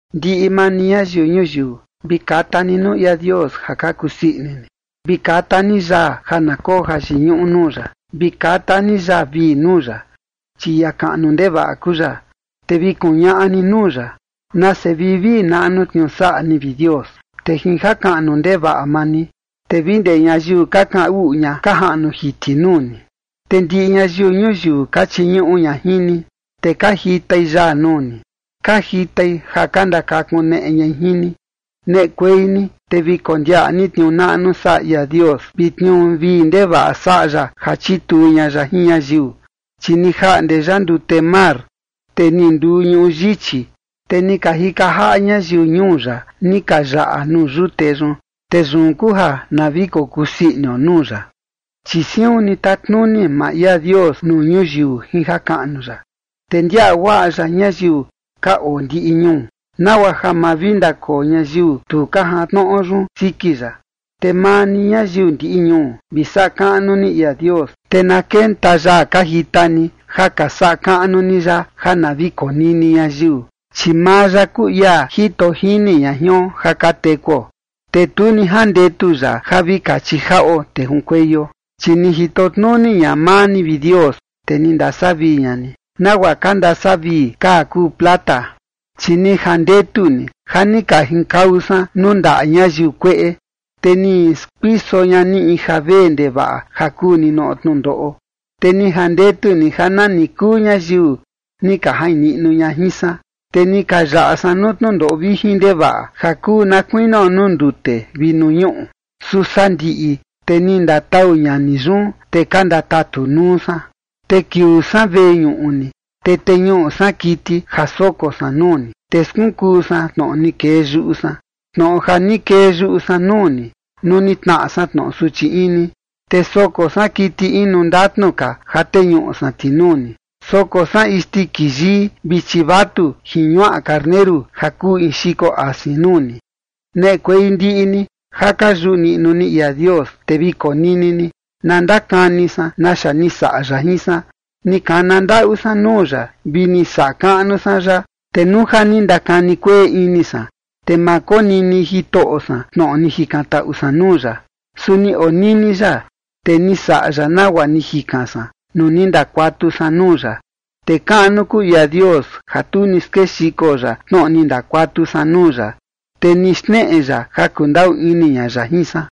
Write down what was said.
Ndiꞌi maa ni, ñayiu ñuyiu, vi kata ni nuu ia Dios ja ka kusii ini ni. Vi kata ni yaa, ja na koo jayiñuꞌu nuu ya. Vi kata ni yaa vii nuu ya, chi ia kaꞌnu ndevaꞌa kuu ya. Te vi kuñaꞌa ni nuu ya: “Nase vivii naꞌnu tniuu saꞌa ni, vi Dios, te jin jakaꞌnu ndevaꞌa maa ni, te vi ndee ñayiu ka kaꞌan uꞌu ña ka jaꞌnu jiti nuu ni. Te ndiꞌi ñayiu ñuyiu ka chiñuꞌu ña jin ni, te ka jitai yaa nuu ni. Ka jitai ja ka ndakakuneꞌe ñai jin ni.” Neꞌekuei ni te vi kondiaꞌa ni tniuu naꞌnu saꞌa ia Dios, vi tniuu vii ndevaꞌa saꞌa ya ja chituu ña ya jin ñayiu. Chi ni jaꞌnde ya ndute mar, te ni nduu ñuꞌu yichi, te ni ka jika jaꞌa ñayiu ñuu ya, ni ka yaꞌa nuu yute yun, te yun kuu ja na vi kokusii inio nuu ya. Chi siun ni tatnuni maa ia Dios nuu ñuyiu jin jakaꞌnu ya, te ndiaꞌa guaꞌa ya ñayiu ka oo ndiꞌi ñuu, nagua ja ma vi ndakoo ñayiu tu ka jantnoꞌo yun siki ya. Te maa ni, ñayiu ndiꞌi ñuu, vi saꞌa kaꞌnu ni ia Dios, te na kenta yaa ka jita ni ja ka saꞌa kaꞌnu ni ya ja na vi konini ñayiu. Chi maa ya kuu ia jito jini ña jion ja ka tekuo, te tu ni jandetu ya ja vi kachi jaꞌo te junkueio. Chi ni jito tnuni ña maa ni, vi Dios, te ni ndasavii ña ni, nagua ka ndasavii kaa kuu plata. Chi ni jandetu ni ja ni ka junkau san nuu ndaꞌa ñayiu kueꞌe, te ni skuiso ña ni in ja vee ndevaꞌa ja kuu ninoꞌo tnundoꞌo. Te ni jandetu ni ja nani kuu ñayiu ni ka jain niꞌnu ña jin san, te ni ka yaꞌa san nuu tnundoꞌo vijin ndevaꞌa, ja kuu na kuinio nuu ndute vi nuu ñuꞌu, su sandiꞌi te ni ndatau ña ni yun, te ka ndatatu nuu san. Te kiuu san veñuꞌu ni, te teñuꞌu san kiti ja soko san nuu ni, te skunkuu san tnoꞌo ni kee yuꞌu san, tnoꞌo ja ni kee yuꞌu san nuu ni, nuu ni tnaꞌa san tnoꞌo suchi ini. Te soko san kiti inu ndatnu ka ja teñuꞌu san ti nuu ni. Soko san isndiki yii vi chivatu jin ñuaꞌa karneru ja kuu in xiko asin nuu ni. Neꞌekuei ndiꞌi ni ja ka yuꞌu niꞌnu ni ia Dios, te vi konini ni. Na ndakani san naxa ni saꞌa ya jin san. Ni kana ndaꞌu san nuu ya vi ni saꞌa kaꞌnu san ya. Te nuu ja ni ndakani kueꞌe ini san, te ma konini Jitoꞌo san tnoꞌo ni jikantaꞌu san nuu ya. Su ni onini ya, te ni saꞌa ya nagua ni jikan san nuu ni ndakuatu san nuu ya. Te kaꞌnu kuu ia Dios ja tu ni skexiko ya tnoꞌo ni ndakuatu san nuu ya, te ni xneꞌe ya ja kundaꞌu ini ña ya jin san.